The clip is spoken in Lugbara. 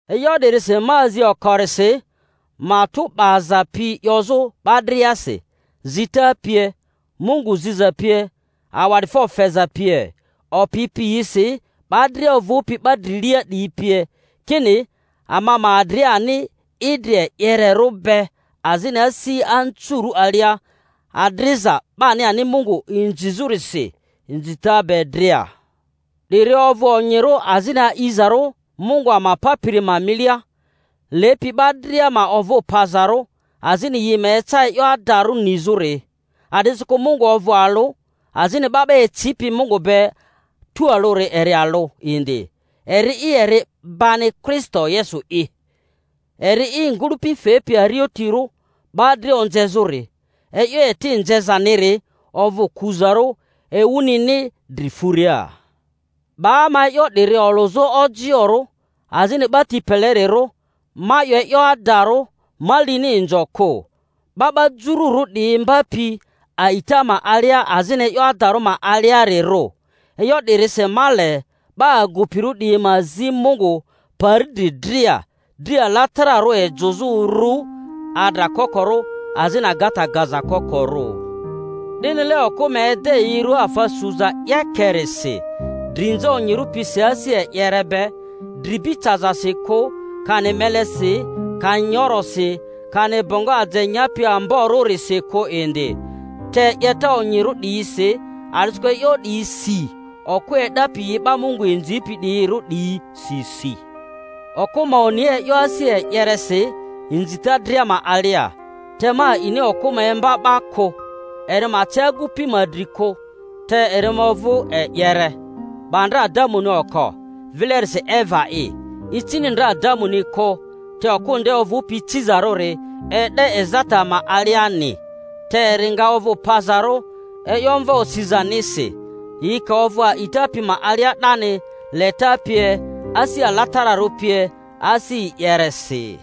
E'yo 'dirisi ma azi okorisi, matᴜ 'baza pi 'yozᴜ 'ba driasi, zita pie, Mungu ziza pie, awa'difo feza pie, opi piyisi, 'ba dria ovᴜpi 'ba drilia 'diyi pie, kini ama ma adri ani idri e'yererᴜ be azini asi anzurᴜ alia, adriza 'bani ani Mungu inzizᴜrisi inzita be dria. 'Diri ovᴜ onyirᴜ azini a'izarᴜ Mungu ama Papiri ma milia, lepi 'ba dria ma ovᴜ pazarᴜ, azini yi ma eca e'yo adarᴜ nizᴜri. A'disikᴜ Mungu ovᴜ alᴜ, azini 'ba 'ba ecipi Mungu be tualᴜri eri alᴜ indi, eri'i eri 'bani, Kristo Yesu'i, eri i ngᴜlᴜpi fepi arotirᴜ 'ba dria onzezᴜri; e'yo eti nzezaniri ovᴜ kuzarᴜ ewunini dri furia. 'Ba ma e'yo 'diri olᴜzᴜ ojioᴜrᴜ azini 'ba ti pelerirᴜ (ma 'yo e'yo adarᴜ, ma lini inzo kᴜ), 'ba 'ba Jururᴜ 'diyi imbapi a'ita ma alia azini e'yo adarᴜ ma aliarirᴜ. E'yo 'dirisi ma le 'ba agupirᴜ 'diyi ma zi Mungu pari dri dria, dri alatararᴜ ejᴜzᴜ uru, adra kokorᴜ azini agata gaza kokorᴜ; 'dinile okᴜ ma ede yi rua afa suza 'yekerisi, drinza onyirᴜ pisi asi e'yereri be; dri'bi cazasi kᴜ, kani melesi, kani nyorosi, kani bongo aje nyapi ambo-rᴜrisi kᴜ indi, te 'yeta onyirᴜ 'diyisi, a'disikᴜ e'yo 'diyi si okᴜ e'dapi yi 'ba Mungu inzipi 'diyirᴜ 'diyi si si. Okᴜ ma oni e'yo asi e'yeresi inzita dria ma alia. Te ma a'ini okᴜ ma imba 'ba kᴜ, eri ma ce agupi ma dri kᴜ; te eri ma ovᴜ e'yere. 'Ba ndra Adamuni oko, vilerisi Eva'i; icini ndra Adamuni kᴜ, te okᴜ nde ovᴜpi icizarᴜri e'de ezata ma aliani. Te eri nga ovᴜ pazarᴜ e'yo mva osizanisi, yi ka ovᴜ a'ita pi ma alia 'dani, leta pie, asi alatararᴜ pie, asi e'yeresi.